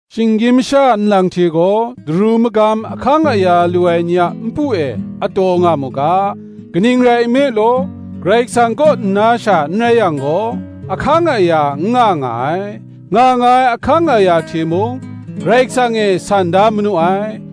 Shinggyim masha nlang hte gaw, daru magam ahkang aya lu ai ni a npu e ataw nga mu ga: kaning rai nme law, Karai Kasang kaw nna sha n rai yang gaw, ahkang aya n nga nga ai: nga nga ai ahkang aya hte mung, Karai Kasang e san da manu ai.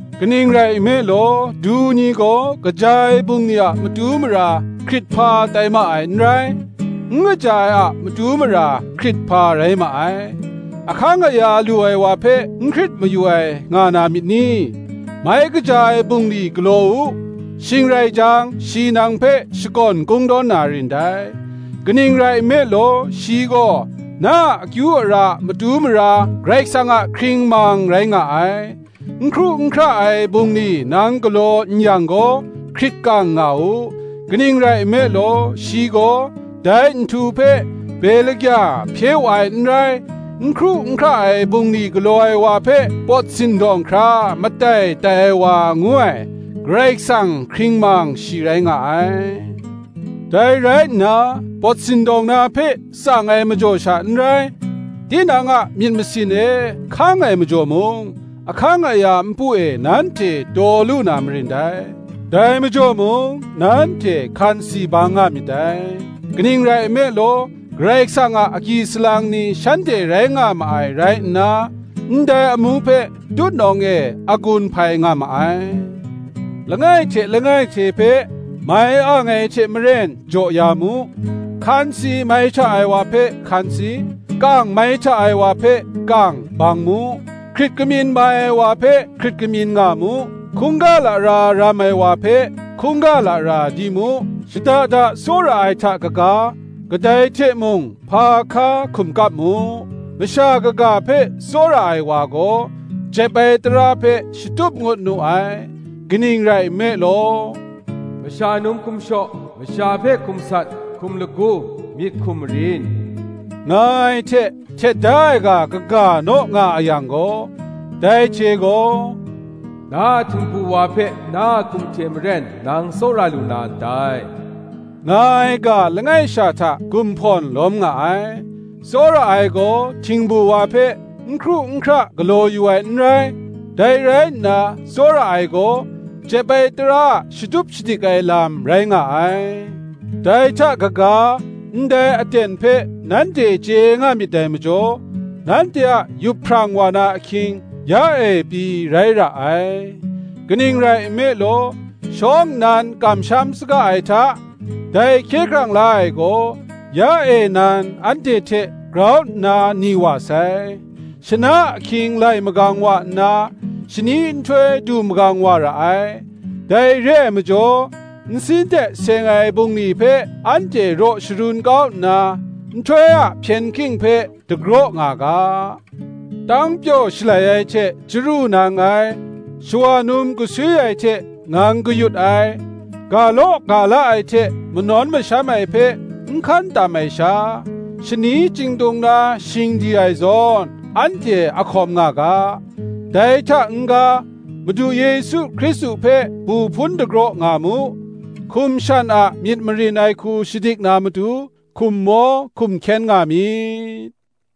Kaning rai nme law, du ni gaw kaja ai bungli a matu mara hkrithpa tai ma ai n rai; n kaja ai a matu mara hkrithpa rai ma ai. Ahkang aya lu ai wa hpe n hkrit mayu ai nga na myit ni? Mai kaja ai bungli galaw u, shing rai jang shi nang hpe shakawn kungdawn na rin dai: kaning rai nme law, shi gaw na a akyu ara a matu mara, Karai Kasang a hkringmang rai nga ai. N hkru n hkra ai bungli nang galaw n yang gaw, hkrit kang nga u; kaning rai nme law, shi gaw dai nhtu hpe be lagya hpye wu ai n rai; n hkru n hkra ai bungli galaw ai wa hpe pawt sindawng hkra matai tai ai wa ngu ai, Karai Kasang hkringmang shi rai nga ai. Dai rai nna, pawt sindawng na hpe tsang ai majaw sha n rai, tinang a myit masin e hkang ai majaw mung, ahkang aya npu e nanhte taw lu na marin dai. Dai majaw mung, nanhte hkansi bang nga myit dai; kaning rai nme law, Karai Kasang a agyi salang ni shanhte rai nga ma ai rai nna, ndai amu hpe tutnawng e a gun hpai nga ma ai. langai hte langai hte hpe mai ang ai hte maren jaw ya mu: hkansi mai hta ai wa hpe hkansi, kang mai hta ai wa hpe kang, bang mu; hkrit kamyin mai ai wa hpe hkrit kamyin nga mu, hkungga lara ram ai wa hpe, hkungga lara di mu. Shada da tsawra ai hta kaga, kadai hte mung hpa hka hkum kap mu: masha kaga hpe tsawra ai wa gaw jep ai tara hpe shatup ngut nu ai. Kaning rai nme law, Masha num hkum shaw, masha hpe hkum sat, hkum lagu, myit hkum marin, nga ai hte htet da ai ga kaga naw nga a yang gaw, dai hte gaw, Na a htingbu wa hpe na a hkum hte maren nang tsawra lu na ndai, nga ai ga langai sha hta gumhpawn lawm nga ai. Tsawra ai gaw htingbu wa hpe n hkru n hkra galaw yu ai n rai: dai rai nna tsawra ai gaw, jep ai tara a shatup shadik ai lam rai nga ai. Dai hta kaga, ndai aten hpe nanhte chye nga myit dai majaw, nanhte a yup hprang wa na ahkying, ya e pyi rai ra ai; kaning rai nme law, shawng nnan kamsham saga ai hta, dai hkye hkrang la ai gaw ya e nan anhte hte grau nna ni wa sai. Shana ahkying lai magang wa nna, shani nhtoi du magang wa ra ai. Dai re ai majaw, nsin hte seng ai bungli hpe anhte raw sharun kau nna, nhtoi a hpyen hking hpe dagraw nga ga. Tangpyaw shalai ai hte chyaru nang ai, shawa num gaswi ai hte ngang kayut ai, ga law ga la ai hte manawn masham ai hpe n hkan tam ai sha, shani chyingtung na shingdi ai zawn anhte a hkawm nga ga. Dai hta n-ga, Madu Yesu Hkristu hpe bu hpun dagraw nga mu: hkum shan a myit marin ai hku shadik na matu, hkum maw hkum hkyen nga myit.